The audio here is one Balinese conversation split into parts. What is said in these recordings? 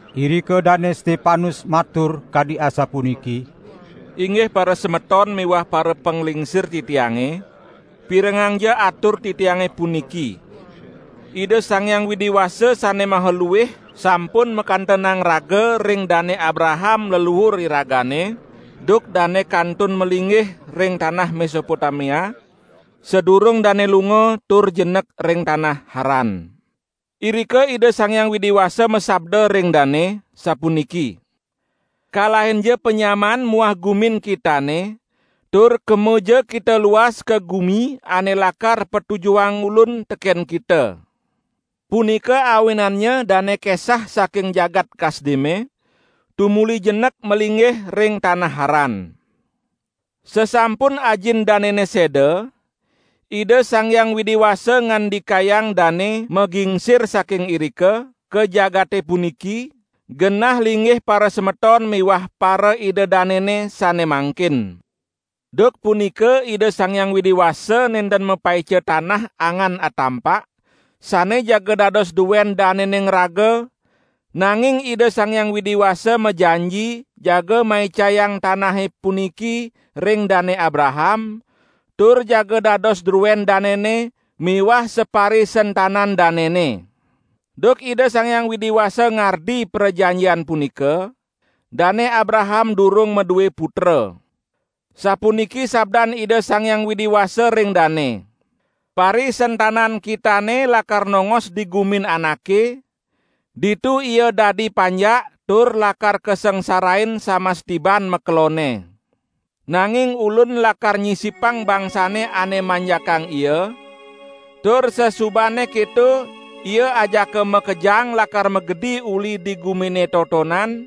Irika Dane Stepanus matur kadi asapuniki: "Inggih parasemeton miwah parapanglingsir titiange, pirengangja atur titiange puniki. Ida Sang Hyang Widi Wasa Sane Maha Luih sampun makantenang raga ring Dane Abraham leluur iragane duk dane kantun malinggih ring tanah Mesopotamia, sadurung dane lunga tur jenek ring tanah Haran. Irika Ida Sang Hyang Widi Wasa masabda ring dane, sapuniki: 'Kalahinja panyamaan muah gumin kitane, tur kemaja kita luas ka gumi ane lakar patujuhang Ulun teken kita!' Punika awinannya dane kesah saking jagat Kasdime tumuli jenek malinggih ring tanah Haran. Sasampun ajin danene seda, Ida Sang Hyang Widi Wasa ngandikayang dane magingsir saking irika, ka jagate puniki, genah linggih parasemeton miwah paraida danene sane mangkin. Duk punika Ida Sang Hyang Widi Wasa nenten mapaica tanah angan atampak, sane jaga dados duen danene ngraga, nanging Ida Sang Hyang Widi Wasa majanji jaga maicayang tanahe puniki ring Dane Abraham, tur jaga dados druen danene miwah saparisentanan danene. Duk Ida Sang Hyang Widi Wasa ngardi prajanjian punika, Dane Abraham durung madue putra. Sapuniki sabdan Ida Sang Hyang Widi Wasa ring dane: 'Parisentanan kitane lakar nongos di gumin anake, ditu ia dadi panjak tur lakar kasangsarain samas tiban makelonne. Nanging Ulun lakar nyisipang bangsane ane manjakang ia, tur sasubane keto ia ajaka makejang lakar magedi uli di gumine totonan,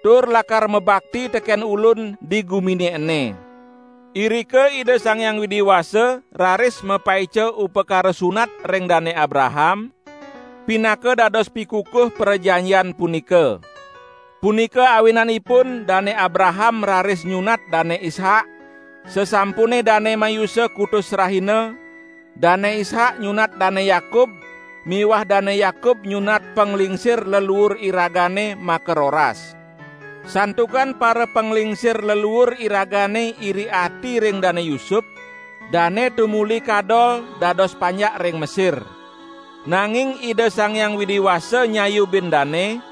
tur lakar mabakti teken Ulun di gumine ene.' Irika Ida Sang Hyang Widi Wasa raris mapaica upakara sunat ring Dane Abraham, pinaka dados pikukuh prajanjian punika. Punika awinanipun Dane Abraham raris nyunat Dane Ishak, sasampune dane mayusa kutus rahina; Dane Ishak nyunat Dane Yakub miwah Dane Yakub nyunat panglingsir leluur iragane makaroras. Santukan parapanglingsir leluur iragane iri ati ring Dane Yusup, dane tumuli kadol dados panjak ring Mesir. Nanging Ida Sang Hyang Widi Wasa nyayubin dane,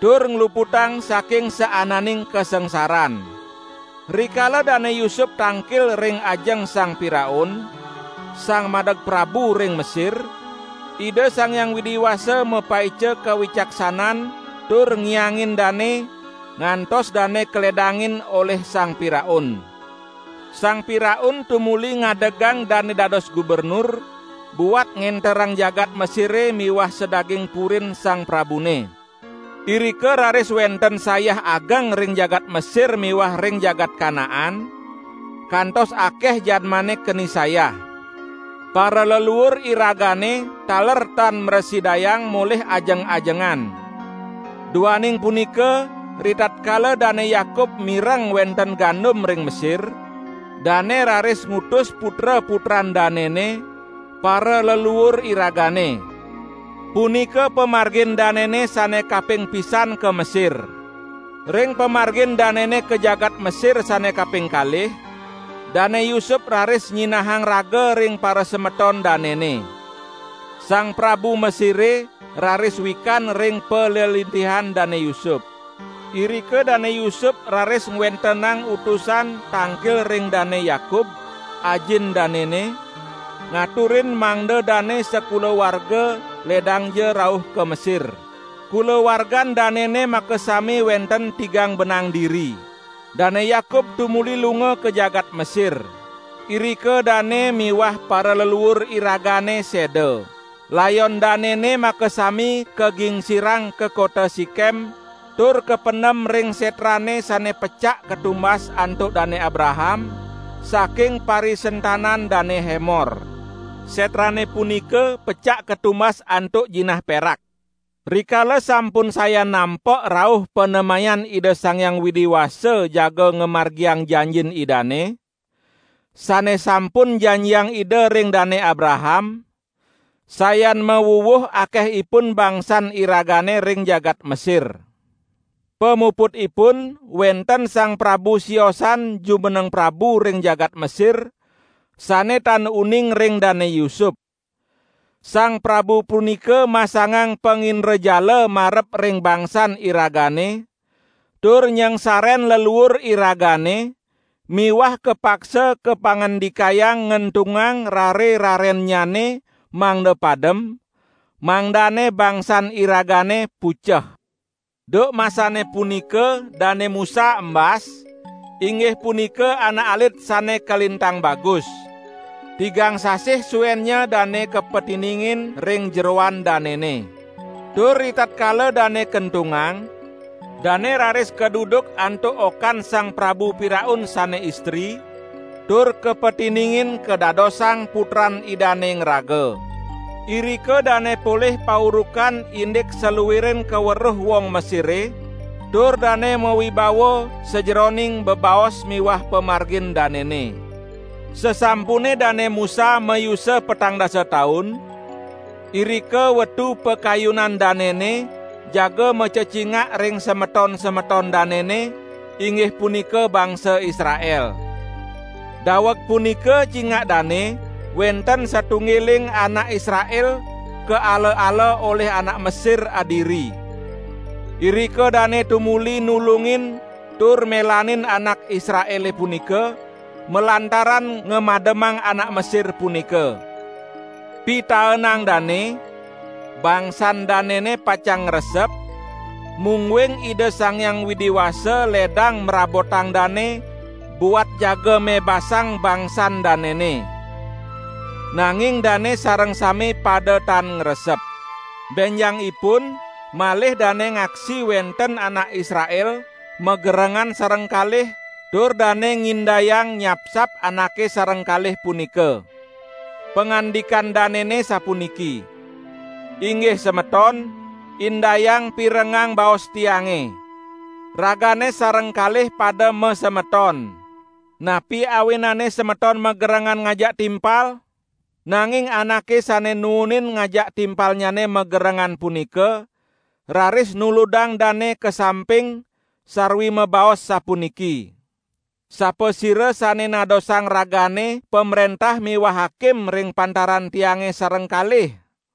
tur ngluputang saking saananing kasangsaran. Rikala Dane Yusup tangkil ring ajeng Sang Piraun, sang madeg prabu ring Mesir, Ida Sang Hyang Widi Wasa mapaica kawicaksanan tur ngiangin dane, ngantos dane kaledangin olih Sang Piraun. Sang Piraun tumuli ngadegang dane dados gubernur buat ngenterang jagat Mesire miwah sadaging purin sang prabune. Irika raris wenten sayah ageng ring jagat Mesir miwah ring jagat Kanaan, kantos akeh jadmane keni sayah. Paraleluur iragane taler tan mrasidayang molih ajeng-ajengan. Duaning punika ritatkala Dane Yakub mireng wenten gandum ring Mesir, dane raris ngutus putra-putran danene, paraleluur iragane. Punika pamargin danene sane kaping pisan ka Mesir. Ring pamargin danene ka jagat Mesir sane kaping kalih, Dane Yusup raris nyinahang raga ring parasemeton danene. Sang prabu Mesire raris wikan ring palelintihan Dane Yusup. Irika Dane Yusup raris ngwentenang utusan tangkil ring Dane Yakub, ajin danene, ngaturin mangda dane sakulawarga ledangja rauh ka Mesir. Kulawargan danene makasami wenten tigang benang diri. Dane Yakub tumuli lunga ka jagat Mesir. Irika dane miwah paraleluur iragane seda. Layon danene makasami kagingsirang ka kota Sikem, tur kapendem ring setrane sane pecak katumbas antuk Dane Abraham, saking parisentanan Dane Hemor. Setrane punika pecak katumbas antuk jinah perak. Rikala sampun sayan nampek rauh panemayan Ida Sang Hyang Widi Wasa jaga ngamargiang janjin Idane, sane sampun janjiang Ida ring Dane Abraham, sayan mawuwuh akehipun bangsan iragane ring jagat Mesir. Pamuputipun wenten sang prabu siosan jumeneng prabu ring jagat Mesir, sane tan uning ring Dane Yusup. Sang prabu punika masangang pangindrajala marep ring bangsan iragane tur nyangsaren leluur iragane miwah kapaksa kapangandikayang ngentungang rare-rarennyane mangda padem, mangdane bangsan iragane puceh. Duk masane punika Dane Musa embas, inggih punika anak alit sane kalintang bagus. Tigang sasih suennya dane kapatiningin ring jeroan danene. Tur ritatkala dane kentungang, dane raris kaduduk antuk okan Sang Prabu Piraun sane istri, tur kapatiningin kadadosang putran idane ngraga. Irika dane polih paurukan indik saluiring kaweruh wong Mesire, tur dane mawibawa sajeroning bebaos miwah pamargin danene. Sasampune Dane Musa mayusa petang dasa taun, irika wetu pakayunan danene jaga macecingak ring semeton-semeton danene, inggih punika bangsa Israel. Daweg punika cingak dane wenten satunggiling anak Israel kaala-ala olih anak Mesir adiri. Irika dane tumuli nulungin tur melanin anak Israele punika malantaran ngamademang anak Mesir punika. ( Pitaenang dane, bangsan danene pacang ngresep, mungguing Ida Sang Hyang Widi Wasa ledang mrabotang dane buat jaga mebasang bangsan danene. Nanging dane sareng sami pada tan ngresep.) Benjangipun malih dane ngaksi wenten anak Israel magerengan sareng kalih tur dane ngindayang nyapsap anake sareng kalih punika. Pangandikan danene sapuniki: 'Inggih semeton indayang pirengang baos tiange. Ragane sareng kalih pada masemeton. Napi awinane semeton magerengan ngajak timpal?' Nanging anake sane nuunin ngajak timpalnyane magerengan punika raris nuludang dane ka samping, sarwi mabaos sapuniki: 'Sapasira sane nadosang ragane pamrentah miwah hakim ring pantaran tiange sareng kalih?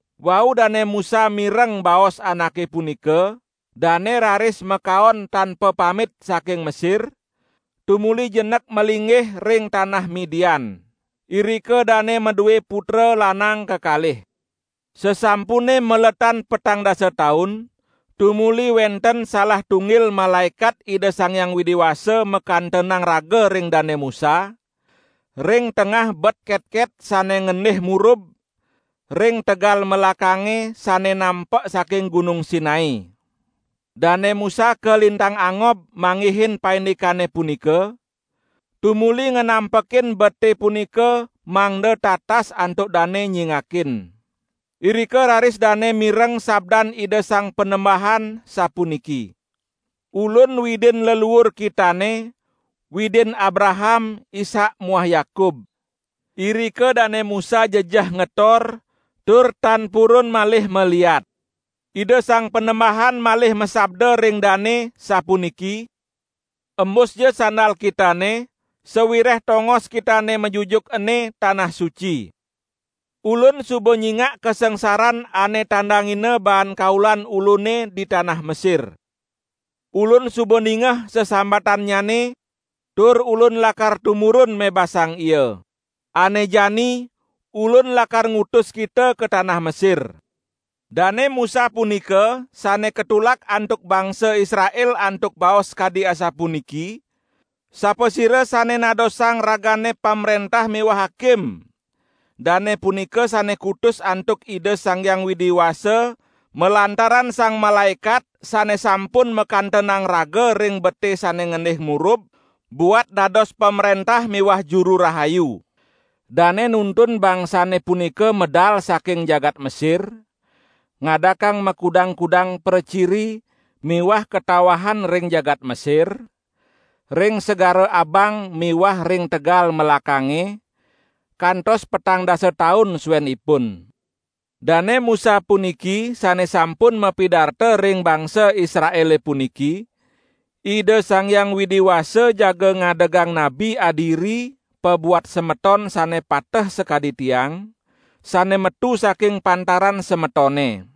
Wau Dane Musa mireng baos anake punika, dane raris makaon tan papamit saking Mesir, tumuli jenek malinggih ring tanah Midian. Irika dane madue putra lanang kekalih. Sasampune maletan petang dasa taun, tumuli wenten salah tunggil malaekat Ida Sang Hyang Widi Wasa makantenang raga ring Dane Musa, ring tengah bet ketket sane ngendih murub, ring tegal melakange sane nampek saking Gunung Sinai. Dane Musa kalintang angob manggihin paindikane punika, tumuli nganampekin bete punika mangda tatas antuk dane nyingakin. Irika raris dane mireng sabdan Ida Sang Panembahan, sapuniki: 'Ulun Widin leluur kitane, Widin Abraham, Ishak muah Yakub.' Irika Dane Musa jejeh ngetor tur tan purun malih maliat. Ida Sang Panembahan malih masabda ring dane, sapuniki: 'Embusja sandal kitane sawireh tongos kitane majujuk ene tanah suci. Ulun suba nyingak kasangsaran ane tandangina baan kaulan Ulune di tanah Mesir. Ulun suba ningeh sesambatannyane, tur Ulun lakar tumurun mebasang ia. Ane jani Ulun lakar ngutus kita ka tanah Mesir.' Dane Musa punika, sane katulak antuk bangsa Israel antuk baos kadi asapuniki: Sapasira sane nadosang ragane pamrentah miwah hakim, dane punika sane kutus antuk Ida Sang Hyang Widi Wasa, malantaran sang malaekat sane sampun makantenang raga ring bete sane ngendih murub, buat dados pamrentah miwah juru rahayu. Dane nuntun bangsane punika medal saking jagat Mesir, ngadakang makudang-kudang praciri miwah katawahan ring jagat Mesir, ring Segara Abang miwah ring tegal melakange, kantos petang dasa taun suenipun. Dane Musa puniki sane sampun mapidarta ring bangsa Israele puniki: 'Ida Sang Hyang Widi Wasa jaga ngadegang nabi adiri pabuat semeton sane pateh sakadi tiang, sane metu saking pantaran semetone.'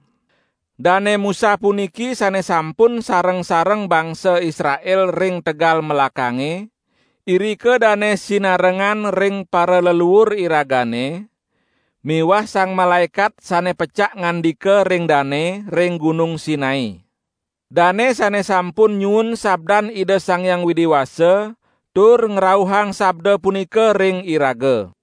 Dane Musa puniki sane sampun sareng-sareng bangsa Israel ring tegal melakange, irika dane sinarengan ring paraleluur iragane miwah sang malaekat sane pecak ngandika ring dane ring Gunung Sinai. Dane sane sampun nyuun sabdan Ida Sang Hyang Widi Wasa tur ngrauhang sabda punika ring iraga.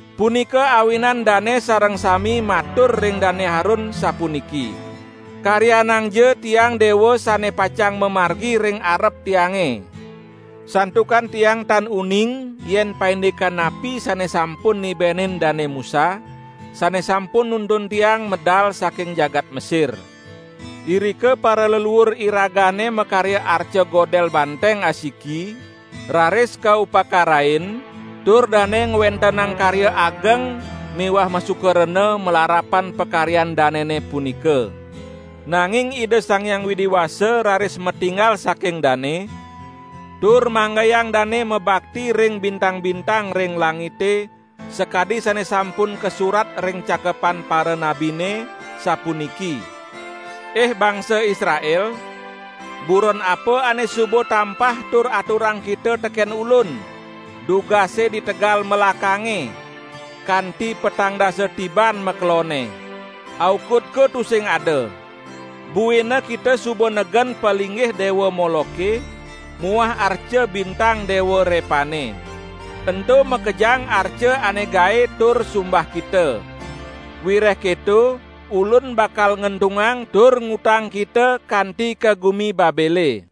Punika awinan dane sareng sami matur ring Dane Harun sapuniki: 'Karyanangja tiang dewa sane pacang mamargi ring arep tiange. Santukan tiang tan uning yen paindikan napi sane sampun nibenin Dane Musa, sane sampun nuntun tiang medal saking jagat Mesir.' Irika paraleluur iragane makarya arca godel banteng asiki, raris kaupakarain, tur dane ngwentenang karya ageng miwah masuka rena malarapan pakaryan danene punika. Nanging Ida Sang Hyang Widi Wasa raris matinggal saking dane, tur manggayang dane mabakti ring bintang-bintang ring langite sakadi sane sampun kasurat ring cakepan paranabine, sapuniki: Ih bangsa Israel! Buron apa ane suba tampah tur aturang kita teken Ulun, dugase di tegal melakange, kanti petang dasa tiban makelonne. Aukudko tusing ada. Buina kita suba negen palinggih Dewa Moloke muah arca bintang Dewa Repane. Ento makejang arca ane gae tur sumbah kita. Wireh keto Ulun bakal ngentungang tur ngutang kita kanti ka gumi Babele.'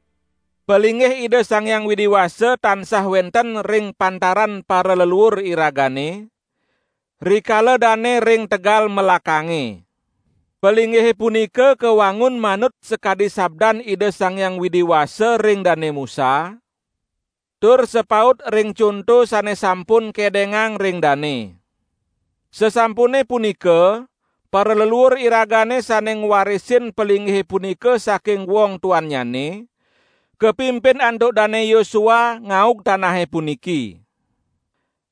Palinggih Ida Sang Hyang Widi Wasa tansah wenten ring pantaran paraleluur iragane, rikala dane ring tegal melakange. Palinggihe punika kawangun manut sakadi sabdan Ida Sang Hyang Widi Wasa ring Dane Musa, tur sapaut ring conto sane sampun kedengang ring dane. Sasampune punika paraleluur iragane sane ngwarisin palinggihe punika saking wong tuannyane, kapimpin antuk Dane Yosua ngaug tanahe puniki.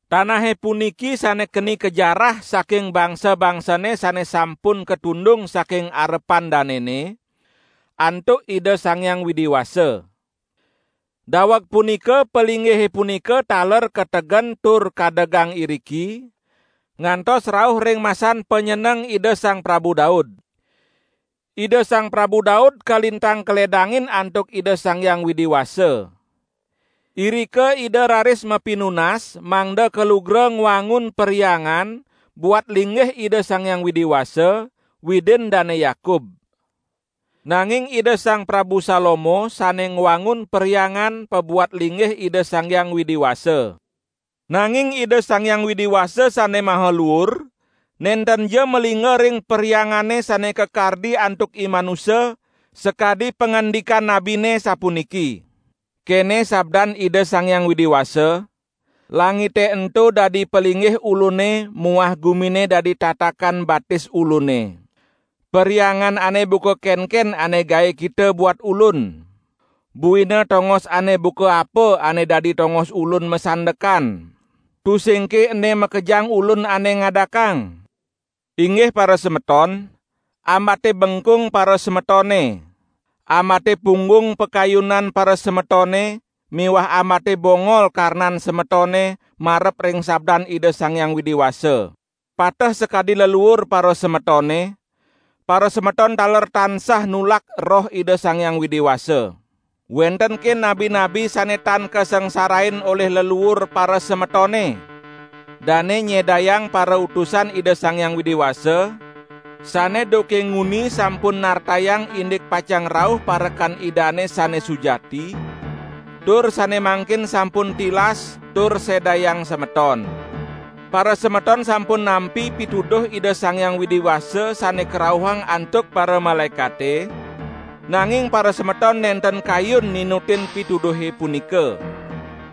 Tanahe puniki sane keni kajarah saking bangsa-bangsane sane sampun katundung saking arepan danene, antuk Ida Sang Hyang Widi Wasa. Daweg punika palinggihe punika taler kategen tur kadegang iriki, ngantos rauh ring masan panyeneng Ida Sang Prabu Daud. Ida Sang Prabu Daud kalintang kaledangin antuk Ida Sang Hyang Widi Wasa. Irika ida raris mapinunas mangda kalugra ngwangun perhyangan buat linggih Ida Sang Hyang Widi Wasa, Widin Dane Yakub. Nanging Ida Sang Prabu Salomo sane ngwangun Perhyangan pabuat linggih Ida Sang Hyang Widi Wasa. Nanging Ida Sang Hyang Widi Wasa Sane Maha Luur, nentenja malingga ring perhyangane sane kakardi antuk imanusa, sakadi pangandikan nabine sapuniki: 'Kene sabdan Ida Sang Hyang Widi Wasa: Langite ento dadi palinggih Ulune muah gumine dadi tatakan batis Ulune. Perhyangan ane buka kenken ane gae kita buat Ulun? Buina tongos ane buka apa ane dadi tongos Ulun masandekan? Tusingke ene makejang Ulun ane ngadakang?' Inggih parasemeton! Ambate bengkung parasemetone! Ambate punggung pakayunan parasemetone miwah ambate bongol karnan semetone marep ring sabdan Ida Sang Hyang Widi Wasa. Pateh sakadi leluur parasemetone, parasemeton taler tansah nulak Roh Ida Sang Hyang Widi Wasa. Wentenke nabi-nabi sane tan kasangsarain olih leluur parasemetone? Dane nyedayang parautusan Ida Sang Hyang Widi Wasa, sane duke nguni sampun nartayang indik pacang rauh Parekan Idane sane sujati, tur sane mangkin sampun tilas tur sedayang semeton. Parasemeton sampun nampi pituduh Ida Sang Hyang Widi Wasa sane karauhang antuk paramalaekate, nanging parasemeton nenten kayun ninutin pituduhe punika!"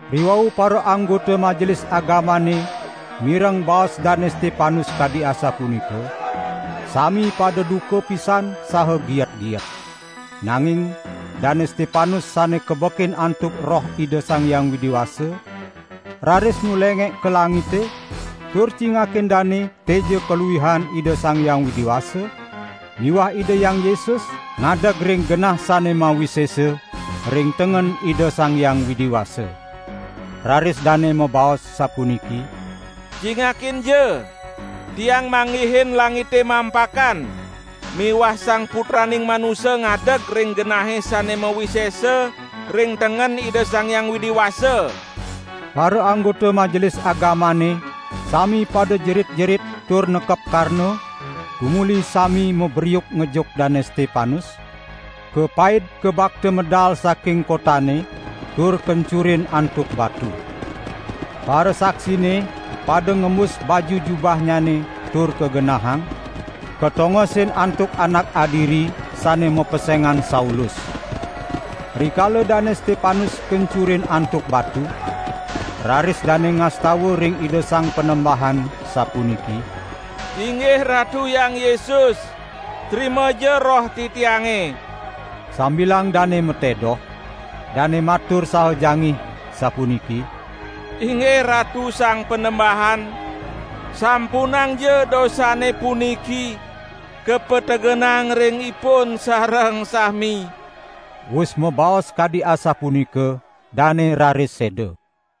Riwau paraanggota Majelis Agamane mireng baos Dane Stepanuse kadi asapunika, sami pada duka pisan saha giet-giet. Nanging Dane Stepanus sane kabekin antuk Roh Ida Sang Hyang Widi Wasa, raris nulengek ka langite tur cingakin dane teja kaluihan Ida Sang Hyang Widi Wasa miwah Ida Hyang Yesus ngadeg ring genah sane mawisesa ring tengen Ida Sang Hyang Widi Wasa. Raris dane mabaos sapuniki: "Cingakinja, tiang manggihin langite mampakan, miwah Sang Putraning Manusa ngadeg ring genahe sane mawisesa ring tengen Ida Sang Hyang Widi Wasa!" Paraanggota Majelis Agamane sami pada jerit-jerit tur nekep karna tumuli sami mabriuk ngejuk Dane Stepanus, kapaid kabakta medal saking kotane tur kencurin antuk batu. Parasaksine pada ngembus baju jubahnyane tur kagenahang, katongosin antuk anak adiri sane mapesengan Saulus. Rikala Dane Stepanus kencurin antuk batu, raris dane ngastawa ring Ida Sang Panembahan, sapuniki: "Inggih Ratu Hyang Yesus, trimaja roh titiange." Sambilang dane matedoh, dane matur saha jangih sapuniki: "Inggih Ratu Sang Panembahan, sampunangja dosane puniki kapategenang ring ipun sareng sami." Wus mabaos kadi asapunika, dane raris seda.